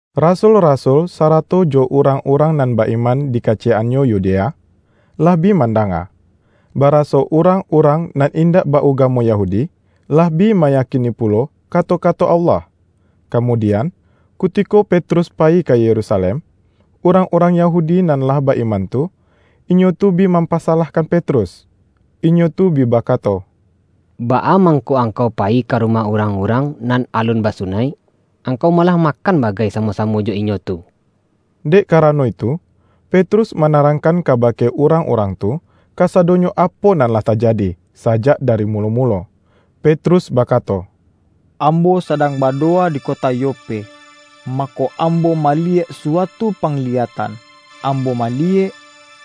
Rasul-rasul, sarato jo urang-urang nan ba-iman di kaciyek-annyo Yudea, lah bi mandanga, baraso urang-urang nan indak ba-ugamo Yahudi, lah bi mayakini pulo kato-kato Allah. Kamudian, kutiko Petrus payi ka Yerusalem, urang-urang Yahudi nan lah ba-iman tu, inyo tu bi mampasalahkan Petrus. Inyo tu bi bakato,”Baa mangko angkau payi ka rumah urang-urang nan alun basunaik? Angkau malah makan bagai samo-samo jo inyo tu!” Dek karano itu, Petrus manarangkan kabake urang-urang tu, kasadonyo apo nan lah tajadi, sajak dari mulo-mulo. Petrus bakato, ”Ambo sadang badowa di kota Yope, mako, ambo maliyek suatu pangliyatan. Ambo maliyek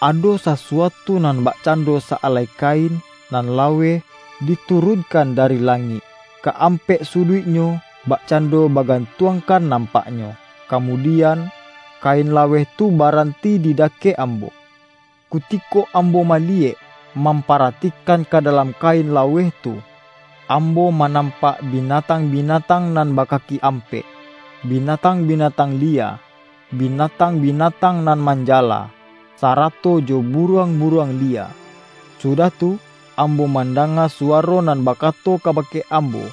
ado sasuatu nan bakcando sa-alai kain nan laweh, diturunkan dari langik, ka-ampek suduiknyo bakcando bagantuangkan nampaknyo, kamudian, kain laweh tu baranti di dakek ambo. Kutiko ambo maliyek, mamparatikan ka dalam kain laweh tu, ambo manampak binatang-binatang nan bakaki ampek, binatang-binatang liya, binatang-binatang nan manjala, sarato jo buruang-buruang liya. Sudah tu, ambo mandanga suwaro nan bakato kabake ambo,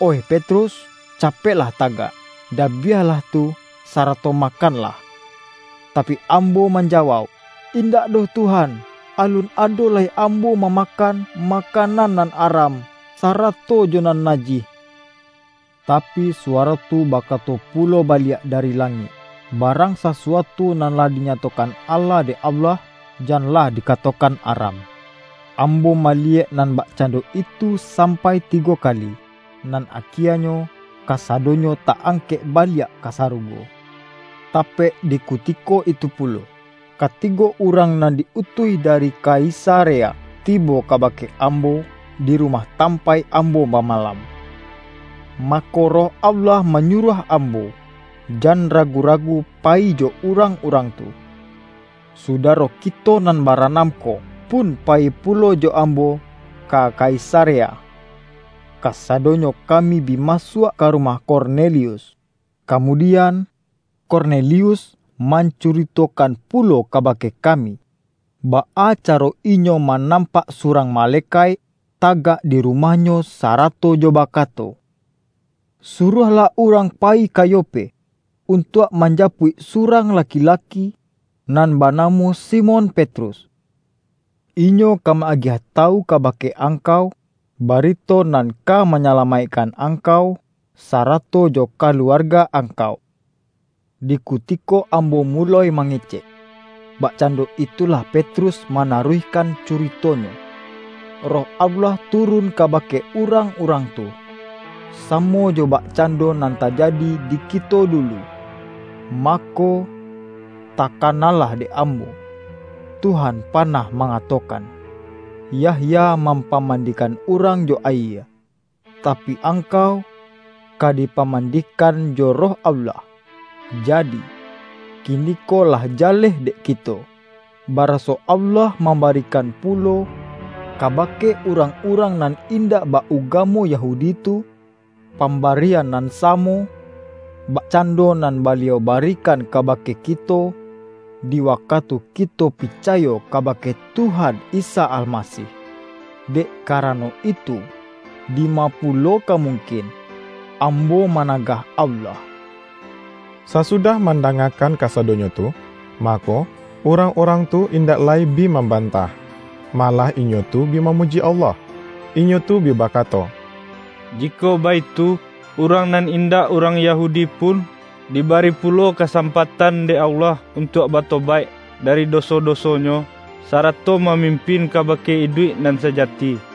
’Oih Petrus, capeklah tagak! Dabiahlah tu, sarato makanlah!' Tapi, ambo manjawauk, ’Indak doh Tuhan! Alun ado lai ambo mamakan, makanan nan aram, sarato jo nan najih.’ Tapi, suwaro tu bakato pulo baliak dari langik, ’Barang sasuatu nan lah dinyatokan ala dek Allah, janlah dikatokan aram.’ Ambo maliyek nan bakcando itu sampai tigo kali, nan akienyo, kasadonyo ta-angkek baliak ka sarugo. Tapek di kutiko itu pulo, katigo urang nan di-utuih dari Kaisarea tibo kabake ambo, di rumah tampaik ambo bamalam. Mako, Roh Allah manyuruah ambo, jan ragu-ragu payi jo urang-urang tu. Sudaro kito nan baranam ko pun payi pulo jo ambo ka Kaisarea, kasadonyo kami bi masuak ka rumah Kornelius. Kamudian, Kornelius mancuritokan pulo kabake kami, baa caro inyo manampak surang malekaik, tagak di rumahnyo sarato jo bakato, ’Suruahlah urang payi ka Yope, untuak manjapuik surang laki-laki nan banamo Simon Petrus. Inyo ka ma-agiah tawu kabake angkau, barito nan ka manyalamaikkan angkau, sarato jo kaluarga angkau.’ Di kutiko ambo muloi mangecek,” bakcando itulah Petrus manaruihkan curitonyo," Roh Allah turun kabake urang-urang tu, samo jo bakcando nan tajadi di kito dulu. Mako, takanalah dek ambo, Tuhan panah mangatokan, ’Yahya mampamandikan urang jo ayie, tapi, angkau ka dipamandikan jo Roh Allah.’ Jadi, kiniko lah jaleh dek kito, baraso Allah mambarikan pulo kabake urang-urang nan indak ba-ugamo Yahudi tu, pambarian nan samo, bakcando nan Baliau barikan kabake kito, di wakatu kito picayo kabake Tuhan Isa Almasih. Dek karano itu, dima pulo ka mungkin ambo managah Allah!” Sasudah mandangakan kasadonyo tu, mako, urang-urang tu indak lai bi mambantah. Malah inyo tu bi mamuji Allah. Inyo tu bi bakato,”Jikok baitu, urang nan indak urang Yahudi pun, dibari pulo kasampatan dek Allah untuak batobaik dari doso-dosonyo, sarato mamimpin kabake iduik nan sajati!”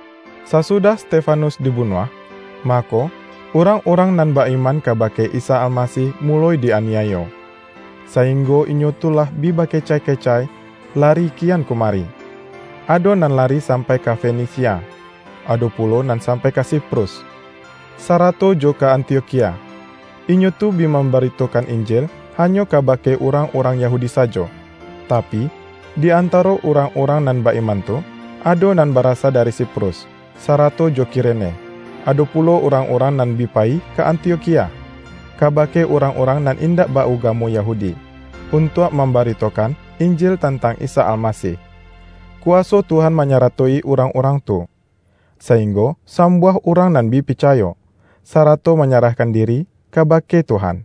Sasudah Stefanus dibunuah, mako, urang-urang nan ba-iman kabake Isa Almasih muloi di-aniayo, sainggo inyo tu lah bi bakecai-kecai lari kian kumari. Ado nan lari sampai ka Fenisia, ado pulo nan sampai ka Siprus, sarato jo ka Antiokhia. Inyo tu bi mambaritokan Injil hanyo kabake urang-urang Yahudi sajo. Tapi, di antaro urang-urang nan ba-iman tu, ado nan barasa dari Siprus, sarato jo Kirene, ado pulo urang-urang nan bi payi ka Antiokhia, kabake urang-urang nan indak ba-ugamo Yahudi, untuak mambaritokan Injil tantang Isa Almasih. Kuwaso Tuhan manyaratoi urang-urang tu, sainggo sambuah urang nan bi picayo, sarato manyarahkan diri kabake Tuhan.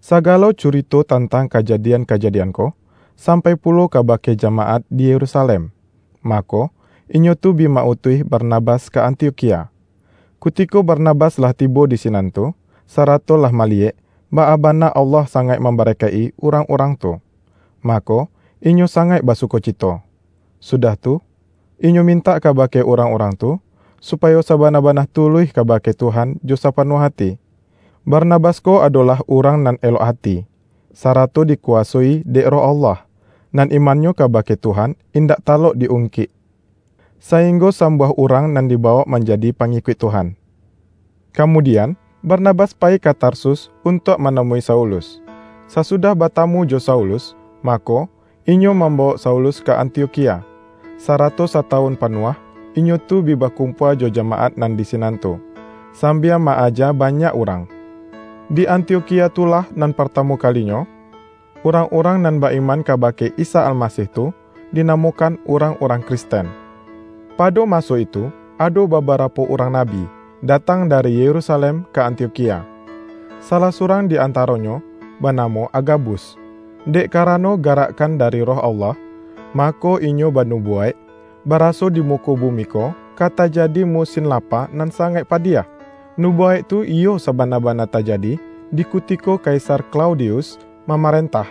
Sagalo curito tantang kajadian-kajadian ko, sampai pulo kabake jamaat di Yerusalem. Mako, inyo tu bi ma-utuih Barnabas ka Antiokhia. Kutiko Barnabas lah tibo di sinan tu, sarato lah maliyek, baa bana Allah sangaik mambarakaik-i urang-urang tu, mako, inyo sangaik basukocito. Sudah tu, inyo mintak kabake urang-urang tu, supayo sabana-bana tuluih kabake Tuhan jo sapanuah ati. Barnabas ko adolah urang nan elok ati, sarato dikuwasoi dek Roh Allah, nan imannyo kabake Tuhan indak talok di-ungkik, sainggo sambuah urang nan dibawok manjadi pangikuik Tuhan. Kamudian, Barnabas payi ka Tarsus untuak manamui Saulus. Sasudah batamu jo Saulus, mako, inyo mambawok Saulus ka Antiokhia, sarato satawun panuah inyo tu bi bakumpua jo jamaat nan di sinan tu, sambia ma-aja banyak urang. Di Antiokhia tu lah nan partamu kalinyo, urang-urang nan ba-iman kabake Isa Almasih tu, dinamokan urang-urang Kristen. Pado maso itu ado babarapo urang nabi, datang dari Yerusalem ka Antiokhia. Salah surang di antaronyo banamo Agabus. Dek karano garakkan dari Roh Allah, mako inyo banubuwaik, baraso di muko bumi ko ka tajadi musin lapa nan sangaik padiah. (Nubuwaik tu iyo sabana-bana tajadi di kutiko Kaisar Klaudius mamarentah.)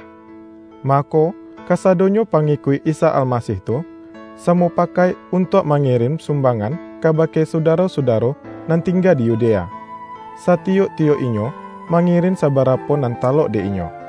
Mako, kasadonyo pangikuik Isa Almasih tu, samupakaik untuak mangirin sumbangan kabake sudaro-sudaro nan tingga di Yudea; satiyok-tiyok inyo mangirin sabarapo nan talok dek inyo.